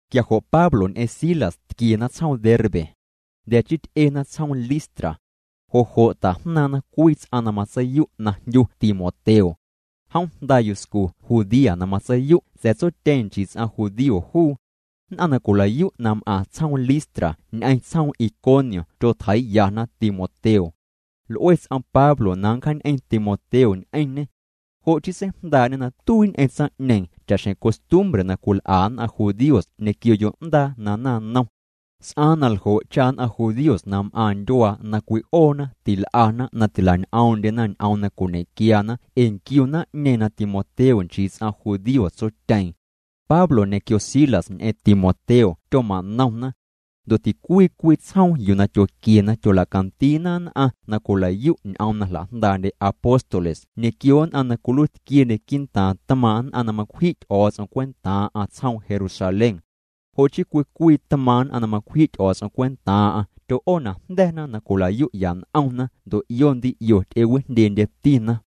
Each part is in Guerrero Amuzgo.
Quia jo' Pablo ñ'eⁿ Silas tquiena tsjoom Derbe. Jnda̱ chii ty'ena tsjoom Listra. Jo' jo' tajnaaⁿ'na cwii ts'aⁿ na matseiyu' na jndyu Timoteo. Jom jnda yuscu ts'aⁿ judía na matseiyu' sa̱a̱ tsotyeeⁿ nchii ts'aⁿ judío juu. Nn'aⁿ na cwilayu' na m'aⁿ tsjoom Listra ñ'eⁿ tsjoom Iconio tyotjeii'yana Timoteo. L'ue ts'om Pablo na nncjaañ'eⁿ Timoteo ñ'eⁿñê. Jo' chii seijndaa'ñê na tuii ñ'eⁿ tsaⁿ'ñeeⁿ cha'xjeⁿ costumbre na cwil'a nn'aⁿ judíos ñequio yo'ndaa na naⁿnom. S'aaⁿ na ljo' cha nn'aⁿ judíos na m'aⁿ ndyuaa na cwi'oona til'ana na tila'ñoom'ndyena ñ'oom na cwiñequiana ee nquiu naⁿ'ñeeⁿ na Timoteo nchii ts'aⁿ judío tsotyeeⁿ. Pablo ñequio Silas ñ'eⁿ Timoteo tyoma'nomna. Ndo' ticwii cwii tsjoom yuu na tyoquiena tyola'candiina nn'aⁿ na cwila'yu' ñ'oom na jla'jndaa'ndye apóstoles ñequio nn'aⁿ na cwiluiitquiendye quii'ntaaⁿ tmaaⁿ' nn'aⁿ na macwji' Ty'o̱o̱ts'om cwentaaⁿ'aⁿ tsjoom Jerusalén. Jo' chii cwii cwii tmaaⁿ' nn'aⁿ na macwji' Ty'o̱o̱ts'om cwentaaⁿ'aⁿ tyo'oonajnda̱na na cwila'yu'ya n'omna ndo' 'io ndii 'io ty'ewijndyendyetina.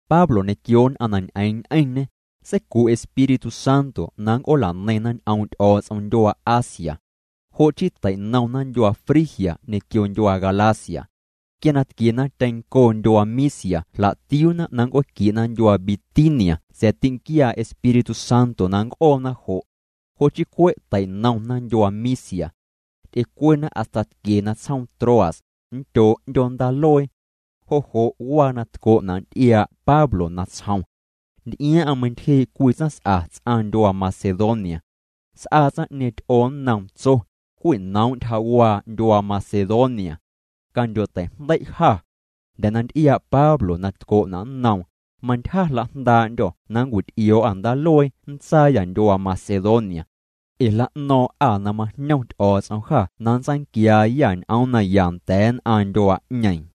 Pablo ñequio nn'aⁿ na ñ'eeⁿ ñ'eⁿñê, seicu' Espíritu Santo na nnc'oola'neiⁿna ñ'oom' Ty'o̱o̱ts'om ndyuaa Asia. Jo' chii tei'nomna ndyuaa Frigia ñequio ndyuaa Galacia. Quia na tquiena tyeⁿncoo ndyuaa Misia jla'tiuuna na nnc'ooquie'na ndyuaa Bitinia sa̱a̱ tinquiaa Espíritu Santo na nnc'oona jo'. Jo' chii cwe' tei'nomna ndyuaa Misia. Ty'ecuena hasta tquiena tsjoom Troas, nndyoo' 'ndyoo ndaaluee. Jo' jo' waa na tco'na' nty'iaa' Pablo natsjom. Nty'iaaⁿ'aⁿ meintyjee' cwii tsaⁿs'a ts'aⁿ ndyuaa Macedonia. S'aa tsaⁿ'ñeeⁿ ty'oo nnoom, tso: “Cwinoom' ntyjawaa ndyuaa Macedonia. Candyo'tei'jndei' jâ.” Jnda̱ na nty'iaa' Pablo na tco'na' nnoom, mantyja jla'jndaa'ndyô̱ na nncwit'io̱o̱'â ndaaluee nntsaayâ ndyuaa Macedonia. Ee jla'no̱o̱ⁿ'â na majñom Ty'o̱o̱ts'om jâ na nntsaanquiaayâ ñ'oom naya nda̱a̱ nn'aⁿ ndyuaa'ñeeⁿ.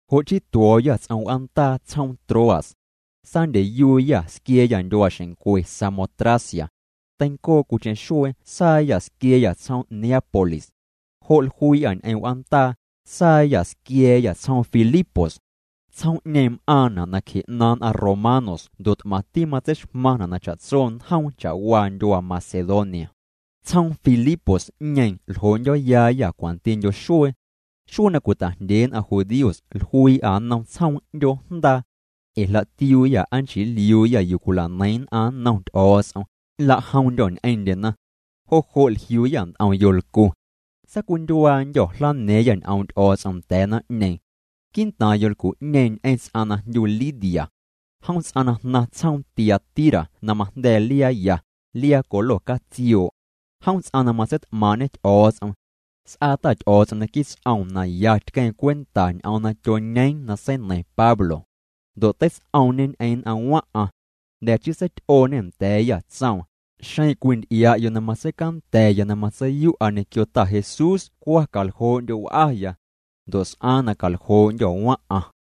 Jo' chii tuo̱o̱yâ ts'om w'aandaa tsjoom Troas. Saandyeyuuyâ squia̱a̱yâ ndyuaaxeⁿncwe Samotracia. Teincoo cwiicheⁿ xuee saayâ squia̱a̱yâ tsjoom Neápolis. Jo' jluii'â ñ'eⁿ w'aandaa, saayâ squia̱a̱yâ tsjoom Filipos. Tsjoom'ñeeⁿ m'aaⁿna' nacje 'naaⁿ nn'aⁿ romanos ndo' t'maⁿti matseixmaⁿna' na cha'tso njoom cha'waa ndyuaa Macedonia. Tsjoom Filipos'ñeeⁿ ljoo'ndyo̱yaayâ cwantindyo xuee. Xuee na cwita'jndyee nn'aⁿ judíos jluii'â nnom tsjoom 'ndyoo jndaa. Ee jla'tiuuyâ aa nchii nliuuyâ yuu cwila'neiⁿ nn'aⁿ nnom Ty'o̱o̱ts'om, nlajomndyô̱ ñ'eⁿndyena. Jo' jo' jliuuyâ nt'om yolcu. Saacwindyuaandyô̱ jlana̱a̱ⁿyâ ñ'oom' Ty'o̱o̱ts'om nda̱a̱ naⁿ'ñeeⁿ. Quii'ntaaⁿ yolcu'ñeeⁿ ñ'eⁿ ts'aⁿ na jndyu Lidia. Jom ts'aⁿ na jnaⁿ tsjoom Tiatira na majnda̱a̱ liaa ya, liaa colo catsioo'. Jom ts'aⁿ na matseit'maaⁿ'ñê Ty'o̱o̱ts'om. S'aa Ta Ty'o̱o̱ts'om naquii' ts'oom na ya tqueeⁿ cwenta ñ'oom na tyoñeeⁿ na seineiⁿ Pablo. Ndo' teits'oomñê ñ'eⁿ nn'aⁿ waⁿ'aⁿ. Jnda̱ chii seity'ooñê nda̱a̱yâ, tsoom: —Xeⁿ cwinty'ia'yo' na matseicanda̱ya na matseiyu'a ñequio Ta Jesús cwa caljoo'ndyo' w'aya. Ndo' s'aaⁿ na caljoo'ndyô̱ waⁿ'aⁿ.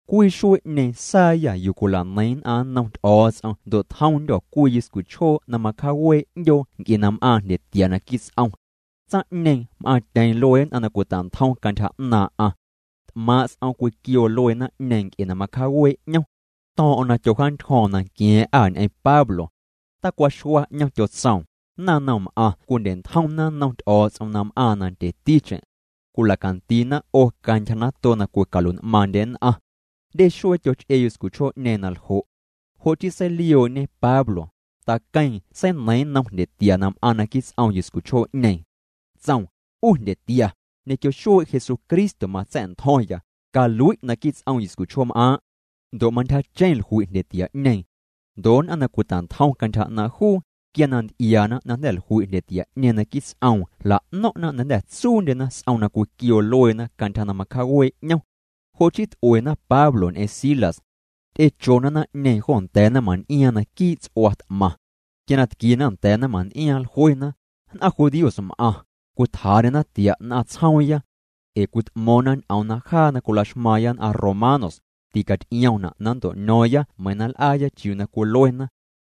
Cwii xuee'ñeeⁿ saayâ yuu cwila'neiⁿ nn'aⁿ nnom Ty'o̱o̱ts'om ndo' tjomndyô̱ cwii yuscuchjoo na macjawee' 'ndyoo nc'e na m'aaⁿ jndyetia naquii' ts'om. Tsaⁿ'ñeeⁿ m'aaⁿtyeeⁿ luee nn'aⁿ na cwita'ntjom cantyja 'naaⁿ'aⁿ. T'maaⁿ' s'om cwiquioo luee naⁿ'ñeeⁿ nc'e na macjawee' 'ñom. To̱o̱ⁿ'o̱ⁿ na tyojaantyjo̱o̱ⁿ nanqua̱a̱ⁿ'â ñ'eⁿ Pablo. Tacwaxua 'ñom, tyotsoom: —Naⁿnomm'aⁿ cwindye'ntjomna nnom Ty'o̱o̱ts'om na m'aaⁿ nandyeticheⁿ. Cwila'candiina 'o cantyja nato na cwicalui'n'maaⁿndye nn'aⁿ. Jndye xuee tyoch'ee yuscuchjoo'ñeeⁿ na ljo'. Jo' chii seilioo'ñe Pablo, taqueeⁿ seineiiⁿ nnom jndyetia na m'aaⁿ naquii' ts'om yuscuchjoo'ñeeⁿ. Tsoom: —'U jndyetia, ñequio xuee' Jesucristo matsa̱'ntjo̱ⁿya, calui' naquii' ts'om yuscuchjoom'aaⁿ'. Ndo' mantyjacheⁿ jlui' jndyetia'ñeeⁿ. Ndo' nn'aⁿ na cwita'ntjom cantyja 'naaⁿ' juu, quia na nty'iaana na jnda̱ jlui' jndyetia'ñeeⁿ naquii' ts'oom jla'no̱ⁿ'na na jnda̱ tsuundyena s'om na cwiquioo lueena cantyja na macjawee' 'ñom. Jo' chii t'uena Pablo ñ'eⁿ Silas. Ty'echona naⁿ'ñeeⁿ jo nda̱a̱ naⁿmaⁿn'iaaⁿ naquii' ts'ua t'maⁿ. Quia na tquiena nda̱a̱ naⁿmaⁿn'iaaⁿ jluena: —Nn'aⁿ judíos m'aⁿ, cwitjaa'ndyena tia' nn'aⁿ tsjoomya. Ee cwit'mo̱o̱ⁿna ñ'oom na jaa na cwilaxmaaⁿya nn'aⁿ romanos, ticaty'iomna' na nnto'ño̱o̱ⁿya meiⁿ na nl'aaya chiuu na cwiluena.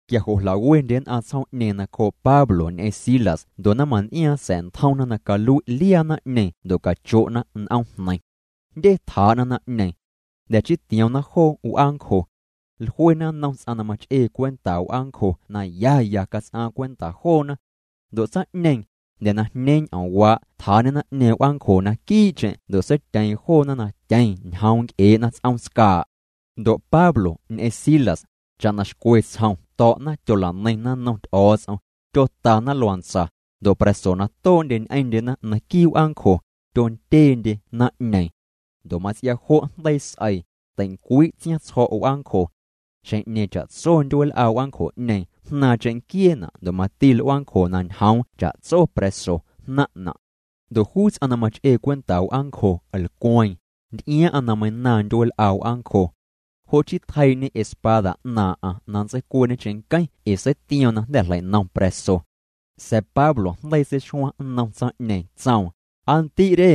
Quia jo' jla'wendye nn'aⁿ tsjoom'ñeeⁿ nacjoo' Pablo ñ'eⁿ Silas ndo' naⁿmaⁿn'iaaⁿ sa̱'ntjomna na calui' liaa naⁿ'ñeeⁿ ndo' cacho'na n'oomjneiⁿ. Jndye tjaa'na naⁿ'ñeeⁿ. Jnda̱ chii tioomna joo w'aancjo. Jluena nnom ts'aⁿ na mach'ee cwenta w'aancjo na ya ya cats'aaⁿ cwenta joona. Ndo' tsaⁿ'ñeeⁿ, jnda̱ na jñeeⁿ ñ'oomwaa' tjaa'ñê naⁿ'ñeeⁿ w'aancjo naquii'cheⁿ ndo' seityeeⁿ joona na tyeⁿ ñjoom' nc'ee'na ts'oom tscaa'. Ndo' Pablo ñ'eⁿ Silas, cha'na xcwe tsjom to̱'na tyola'neiⁿna nnom Ty'o̱o̱ts'om, tyotana luantsa, ndo' pra̱so na too'ndye ñ'eⁿndyena naquii' w'aancjo, tyondyeendye naⁿ'ñeeⁿ. Ndo' mats'ia jo' jndeii s'eii, teincwii' tsiaⁿtsjo̱' w'aancjo. Xjeⁿ'ñeeⁿ cha'tso ndyueel'a w'aancjo'ñeeⁿ jnaaⁿ cheⁿnquieena' ndo' mati l'uaancjo na ñjoom cha'tso pra̱so jnaⁿ'na'. Ndo' juu ts'aⁿ na mach'ee cwenta w'aancjo lcweeⁿ, nty'iaaⁿ'aⁿ na meiⁿnaaⁿ ndyueel'a w'aancjo. Jo' chii tjeii'ñê espada 'naaⁿ'aⁿ na nntseicuee'ñe cheⁿnqueⁿ ee seitioom na jnda̱ jleinom pra̱so. Sa̱a̱ Pablo jndeii seixuaⁿ nnom tsaⁿ'ñeeⁿ tsoom: —Aa ndi' re,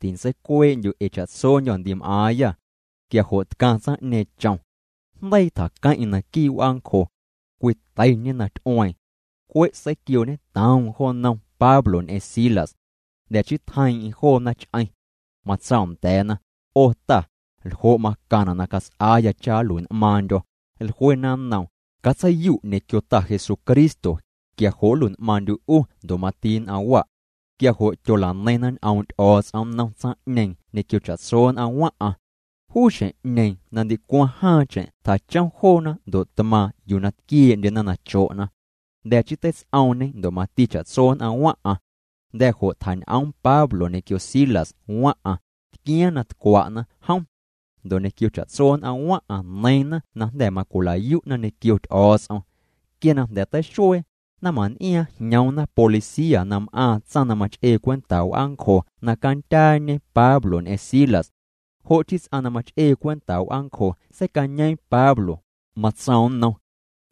tintseicuee'ndyu' ee cha'tsondyô̱ ndi m'aaⁿyâ. Quia jo' tcaⁿ tsaⁿ'ñeeⁿ chom. Jndeii tjaqueⁿ'eⁿ naquii' w'aancjo. Cwiteiñê na ty'ueeⁿ. Cwe' seiquiooñetoom jo nnom Pablo ñ'eⁿ Silas. Jnda̱ chii tjeiiⁿ'eⁿ joona ch'eⁿ. Matsoom nda̱a̱na: —'O ta, ¿ljo' macaⁿna' na cats'aaya cha nlui'n'maaⁿndyo̱? Jluena nnoom: —Catseiyu' ñequio Ta Jesucristo, quia jo' nlui'n'maaⁿndyu' 'u ndo' mati nn'aⁿ wa'. Quia jo' tyola'neiⁿna ñ'oom' Ty'o̱o̱ts'om nnom tsaⁿ'ñeeⁿ ñequio cha'tso nn'aⁿ waⁿ'aⁿ. Juu xjeⁿ'ñeeⁿ na ndicwaⁿ jaaⁿcheⁿ tjachom joona ndo' tmaaⁿ yuu na tquiee'ndyena na cho'na. Jnda̱ chii teits'oomñê ndo' mati cha'tso nn'aⁿ waⁿ'aⁿ. Jnda̱ jo' tjañ'oom Pablo ñequio Silas waⁿ'aⁿ, tquiaaⁿ na tcwa'na. Jom ndo' ñequio cha'tso nn'aⁿ waⁿ'aⁿ neiiⁿna na jnda̱ macwilayu'na ñequio Ty'o̱o̱ts'om. Quia na jnda̱ teixuee, naⁿmaⁿn'iaaⁿ jñoomna policía na m'aaⁿ tsaⁿ na mach'ee cwenta w'aancjo na candyaañe Pablo ñ'eⁿ Silas. Jo' chii ts'aⁿ na mach'ee cwenta w'aancjo seicañeeⁿ Pablo, matsoom nnom: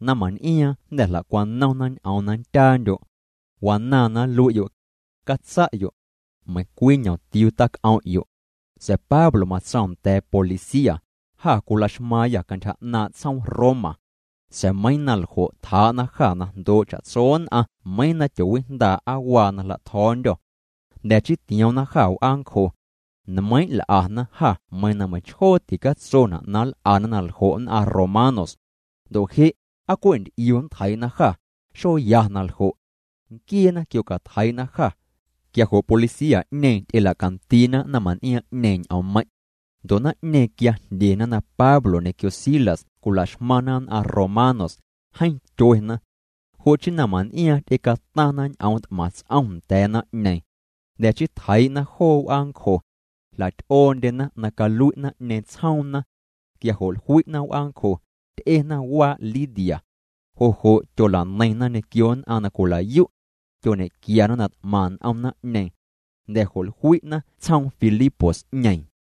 —Naⁿmaⁿn'iaaⁿ jnda̱ jla'cwanomna ñ'oom na nndyaandyo'. Wanaaⁿ na nlui'yo'. Catsa'yo', meiⁿcwii ñomtiuu tac'om'yo'. Sa̱a̱ Pablo matsoom nda̱a̱ policía: —Jâ cwilaxmaaⁿyâ cantyja 'naaⁿ' tsjoom Roma. Sa̱a̱ meiiⁿ na ljo' tjaa'na jâ na jndoo' cha'tso nn'aⁿ meiiⁿ na tyoowijndaa' aa waa na jla'tjo̱o̱ndyô. Jnda̱ chii tioomna jâ w'aancjo. Nmeiiⁿ' l'ana jâ meiiⁿ na meiⁿchjoo ticatsona' na nl'ana na ljo' nn'aⁿ romanos. Ndo' je' ¿aa cwe' nt'iu nntjeii'na jâ? Xoya na ljo'. Nquieena quiocatjeii'na jâ. Quia jo' policía'ñeeⁿ ty'elacandiina naⁿmaⁿn'iaaⁿ'ñeeⁿ ñ'oommeiⁿ'. Ndo' naⁿ'ñeeⁿ quia jndyena na Pablo ñequio Silas cwilaxmaⁿna nn'aⁿ romanos, jeeⁿ tyuena. Jo' chii naⁿmaⁿn'iaaⁿ ty'ecataⁿna ñ'oom t'maⁿ ts'om nda̱a̱ naⁿ'ñeeⁿ. Jnda̱ chii tjeii'na joo w'aancjo. Jla'ty'oondyena na calui' naⁿ'ñeeⁿ tsjoomna. Quia jo' jlui'na w'aancjo, ty'ena waa' Lidia. Jo' jo' tyola'neiⁿna ñequio nn'aⁿ na cwila'yu'. Tyoñe'quiana na t'maⁿ n'om naⁿ'ñeeⁿ. Jnda̱ jo' jlui'na tsjoom Filipos'ñeeⁿ.